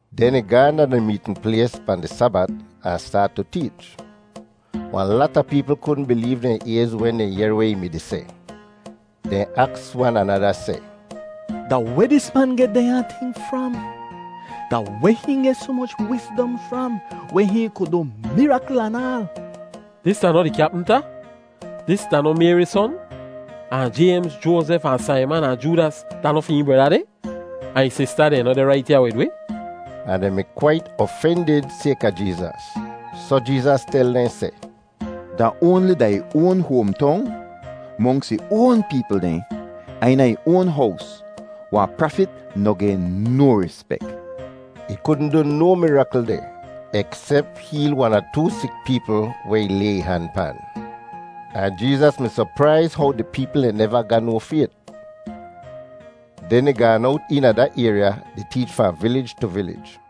Den ih gaahn da di meetn plays pahn di Sabat ahn staat tu teech. Wahn lata peepl kudn bileev dehn ayz wen dehn yehr weh ih mi-di seh. Dehn aks wan anada seh, “Da weh dis man geh dehnya ting fram? Da weh hihn geh soh moch wizdom fram weh hihn ku du mirakl anaal? Dis da noh di kyapmta? Dis da noh Mayri son? Ahn Jaymz, Joazef ahn Saiman ahn Joodas da noh fi hihn breda dehn? Ahn ih sista dehn noh deh rait ya wid wi?” Ahn dehn mi kwait ofendid sayka Jeezas. Soh Jeezas tel dehn seh, “Da oanli da ih oan hoamtong, monks ih oan peepl dehn, ahn eena ih oan hows wahn prafit noh geh no rispek.” Ih kudn du no mirakl deh, eksep heel wan ahn too sik peepl weh ih lay ih han pan. Ahn Jeezas mi sopraiz how di peepl dehn deh neva ga no fayt. Den ih gaan owt eena da ayrya di teech fahn vilij tu vilij.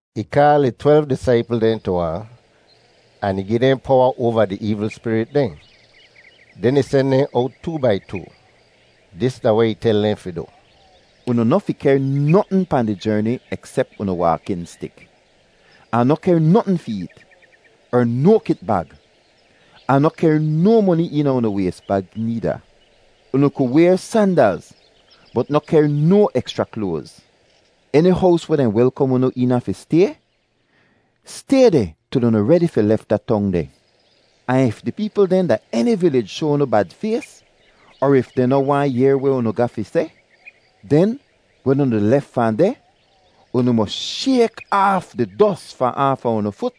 Ih kaal ih twelv disaipl dehn tu ahn, ahn ih gi dehn powa oava di eevl spirit dehn. Den ih sen dehn owt too-bai-too. Dis da weh ih tel dehn fi du: “Unu noh fi kehr notn pahn di jerni eksep unu waakin stik. Ahn noh kehr notn fi eet, er no kitbag, ahn noh kehr no moni eena unu ways bag needa. Unu ku wayr sandalz, bot noh kehr no ekschra kloaz. Eni hows weh dehn welkom unu eena fi stay, stay deh til unu redi fi lef da tong deh. Ahn if di peepl dehn da eni vilij shoa unu bad fays, er if dehn noh waahn yehr weh unu ga fi seh, den wen unu di lef fahn deh, unu mos shayk aaf di dos fahn aafa unu fut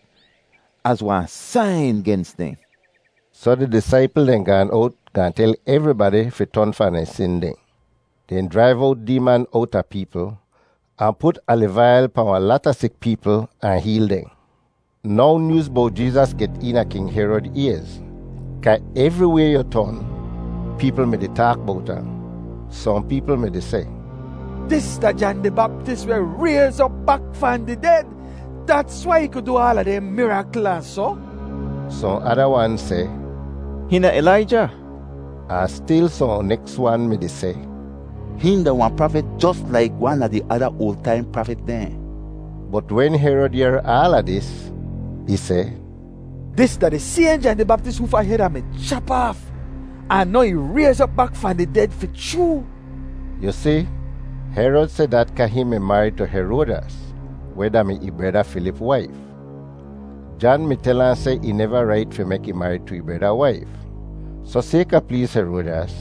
az wahn sain gens dehn.” Soh di disaipl dehn gaan owt gaahn tel evribadi fi ton fahn dehn sin dehn. Dehn jraiv owt deeman owta peepl, ahn put aliv ail pahn wahn lata sik peepl ahn heel dehn. Now nyooz bowt Jeezas get eena King Herod ayz kaa evriway yu ton, peepl mi-di taak bowt ahn. Sohn peepl mi-di seh, “Dis da Jan di Baptis weh rayz op bak fahn di ded. Dats wai ih ku du aala dehn mirakl ahn soh.” Sohn ada wan seh, “Hihn da Ilaija.” Ahn stil sohn neks wan mi-di seh, “Hihn da wahn prafit jos laik wan a di ada oal taim prafit dehn.” Bot wen Herod yehr aala dis, ih seh, “Dis da di sayhn Jan di Baptis hoofa hed Ah mi chap aaf. Ahn now ih rayz op bak fahn di ded fi chroo!” Yu si, Herod seh dat kaa hihn mi marid tu Heroadyas, weh da-mi ih breda Filip waif. Jan mi tel ahn seh ih neva rait fi mek ih marid tu ih breda waif. Soh sayka pleez Heroadyas,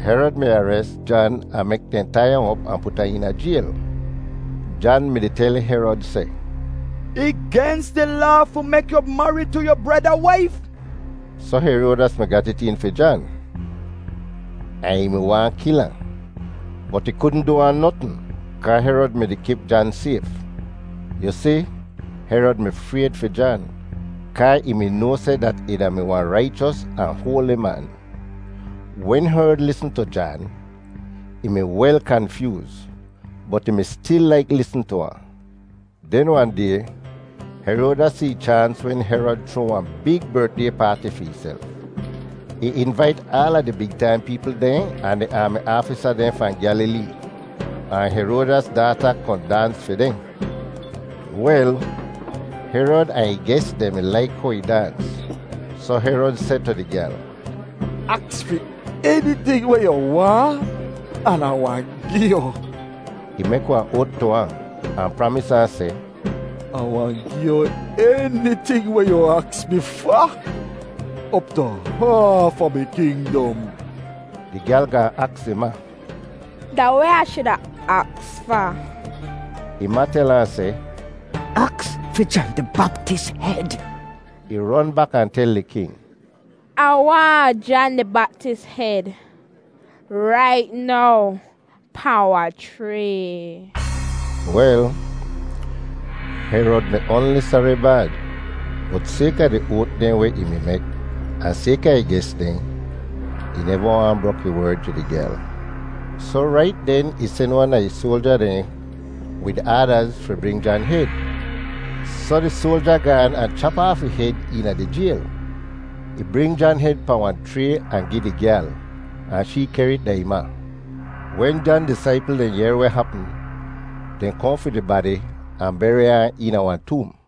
Herod mi ares Jan ahn mek dehn tai ahn op ahn put ahn eena jayl. Jan mi-di tel Herod seh, “Ih gens di laa fi mek yu marid tu yu breda waif.” Soh Heroadyas mi gat it een fi Jan, ahn ih mi waahn kil ahn, bot ih kudn du ahn notn kaa Herod mi-di kip Jan sayf. Yu si, Herod mi frayd fi Jan kaa ih mi noa seh dat ih da-mi wahn raichos ahn hoali man. Wen Herod lisn tu Jan, ih mi wel kanfyooz, bot ih mi stil laik lisn tu ahn. Den wahn day Heroadyas si ih chaans wen Herod chroa wahn big bertday paati fi ihself. Ih invait aala di big taim peepl dehn ahn di aami aafisa dehn fahn Gyalilee, ahn Heroadyas daata kohn daans fi dehn. Wel, Herod ahn ih ges dehn mi laik how ih daans, soh Herod seh tu di gyal, “Aks fi eniting weh yu waahn an Ah wahn gi yu.” Ih mek wahn oat tu ahn, ahn pramis ahn seh, “Ah wahn gi yu eniting weh yu aks mi fa, op tu haaf a mi kingdom.” Di gyal gaahn aks ih ma, “Da weh Ah shuda aks fa?” Ih ma tel ahn seh, “Aks fi Jan di Baptis hed!” Ih ron bak ahn tel di king, “Ah waahn Jan di Baptis hed rait now pahn wahn chray!” Wel, Herod mi oanli sari bad, bot sayka di oat dehn weh ih mi mek, ahn sayka ih ges dehn, ih neva waahn brok ih werd tu di gyal. Soh rait den ih sen wan a ih soalja dehn wid aadaz fi bring Jan hed. Soh di soalja gaan ahn chap aaf ih hed eena di jayl. Ih bring Jan hed pahn wahn chray ahn gi di gyal, ahn shee kehr it da ih ma. Wen Jan disaipl dehn yehr weh hapm, dehn kohn fi di badi ahn beri ahn eena wahn toom.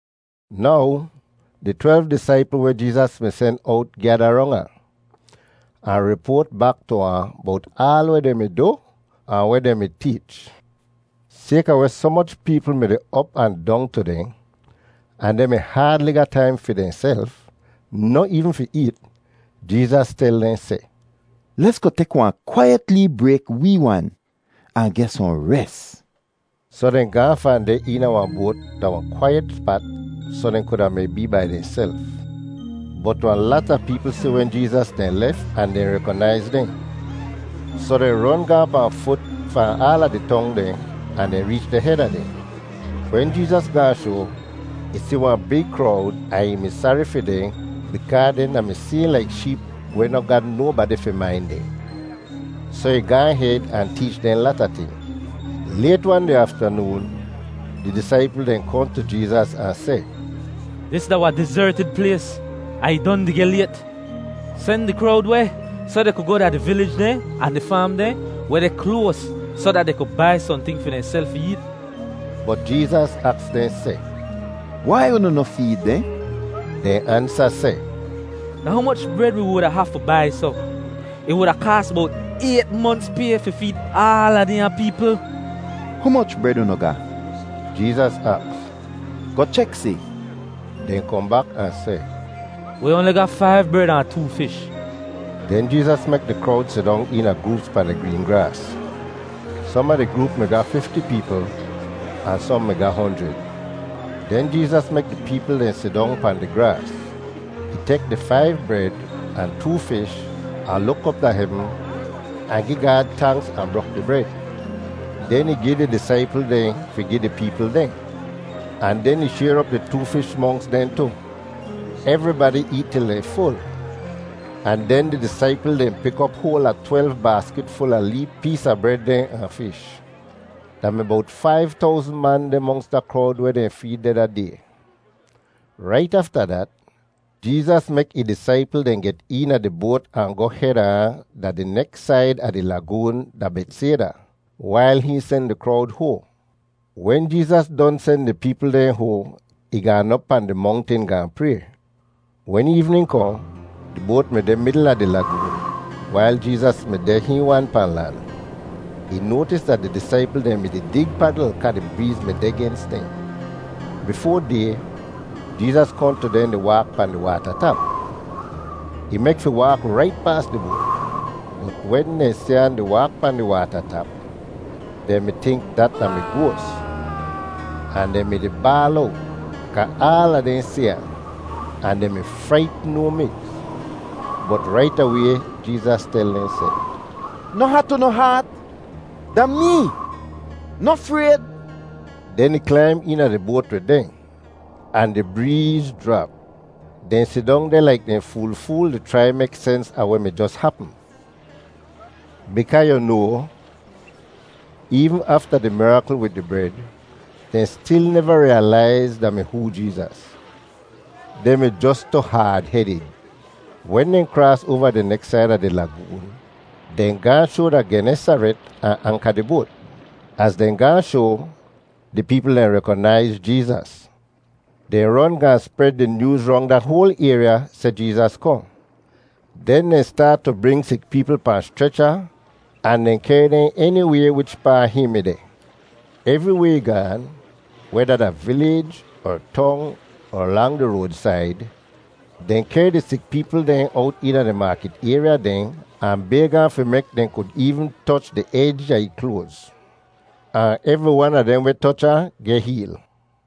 Now di twelv disaipl weh Jeezas mi sen owt gyada rong ahn, ahn ripoat bak tu ahn bowt aal weh dehn mi du ahn weh dehn mi teech. Sayka weh soh moch peepl mi-di op ahn dong tu dehn, ahn dehn mi haadli ga taim fi dehnself, noh eevn fi eet, Jeezas tel dehn seh, “Lesgoh tek wahn kwaiyet lee brayk wee wan, ahn geh sohn res.” Soh dehn gaahn fahn deh eena wahn boat da wahn kwaiyet spat soh dehn kuda mi bee bai dehnself. Bot wahn lata peepl si wen Jeezas dehn lef ahn dehn rekonaiz dehn. Soh dehn ron gaahn pahn fut fahn aala di tong dehn, ahn dehn reech deh heda dehn. Wen Jeezas gaahn shoa, ih si wahn big krowd ahn ih mi sari fi dehn bikaa dehn da-mi sayhn laik sheep weh noh ga nobadi fi main dehn. Soh ih gaahn hed ahn teech dehn lata ting. Layt-wan di aftanoon, di disaipl dehn kohn tu Jeezas ahn seh, “Dis da wahn dizertid plays, ahn ih don di geh layt. Sen di krowd weh, soh dehn ku goh da di vilij dehn ahn di faam dehn weh deh kloas soh dat dehn ku bai sohnting fi dehnself fi eet.” Bot Jeezas aks dehn seh, “Wai unu noh feed dehn?” Dehn ansa seh, “Da humoch bred wi wuda hafu bai soh? Ih wuda kaas bowt ayt monts pay fi feed aala dehnya peepl!” “Humoch bred unu ga?” Jeezas aks. “Goh chek si.” Dehn kohn bak ahn seh, “Wi oanli ga faiv bred ahn too fish.” Den Jeezas mek di krowd sidong eena groops pahn di green graas. Som a di groop mi ga fifti peepl, ahn sohn mi ga honjrid. Den Jeezas mek di peepl dehn sidong pahn di graas. Ih tek di faiv bred ahn too fish ahn luk op da hevn ahn gi Gaad tanks ahn brok di bred. Den ih gi di disaipl dehn fi gi di peepl dehn. Ahn den ih shayr op di too fish monks dehn tu. Evribadi eet til dehn ful, ahn den di disaipl dehn pik op hoal a twelv baaskit ful a di lee pees a bred dehn ahn fish. Da mi bowt faiv towzn man deh monks da krowd weh dehn feed deh da day. Rait afta dat, Jeezas mek ih disaipl dehn get eena di boat ahn goh heda ahn da di neks said a di lagoon da Betsayda, wail hihn sen di krowd hoahn. Wen Jeezas don sen di peepl dehn hoahn, ih gaan op pahn di mongtin gaahn pray. Wen eevnin kohn, di boat mi deh midl a di lagoon, wail Jeezas mi deh hihn wan pahn lan. Ih noatis dat di disaipl dehn mi-di dig padl kaa di breez mi deh gens dehn. Bifoa day, Jeezas kohn tu dehn di waak pahn di waata tap. Ih mek fi waak rait paas di boat. Bot wen dehn si ahn di waak pahn di waata tap, dehn mi tink dat da mi goas, ahn dehn mi-di baal owt kaa aala dehn si ahn, ahn dehn mi fraitn no miks. Bot rait away Jeezas tel dehn seh, “Noh hat unu haat. Da mee. Noh frayd.” Den ih klaim eena di boat wid dehn, ahn di breez jrap! Dehn sidong deh laik dehn fool-fool di chrai mek sens a weh mi jos hapm. Bikaa yu noa, eevn afta di mirakl wid di bred, dehn stil neva riyalaiz da mi hoo Jeezas. Dehn mi jos tu haad-hedid. Wen dehn kraas oava di neks said a di lagoon, dehn gaahn shoa da Genesaret ahn anka di boat. Az dehn gaahn shoa, di peepl dehn rekonaiz Jeezas. Dehn ron gaahn spred di nyooz rong da hoal ayrya seh Jeezas kohn. Den dehn staat tu bring sik peepl pahn schrecha ahn dehn kehr dehn eniway wichpaa hihn mi deh. Evriway ih gaan, weda da vilij er tong er lang di roadsaid, dehn kehr di sik peepl dehn owt eena di maakit ayrya dehn ahn bayg ahn fi mek dehn kud eevn toch di ej a ih kloaz. Ahn evri wan a dehn weh toch ahn geh heel.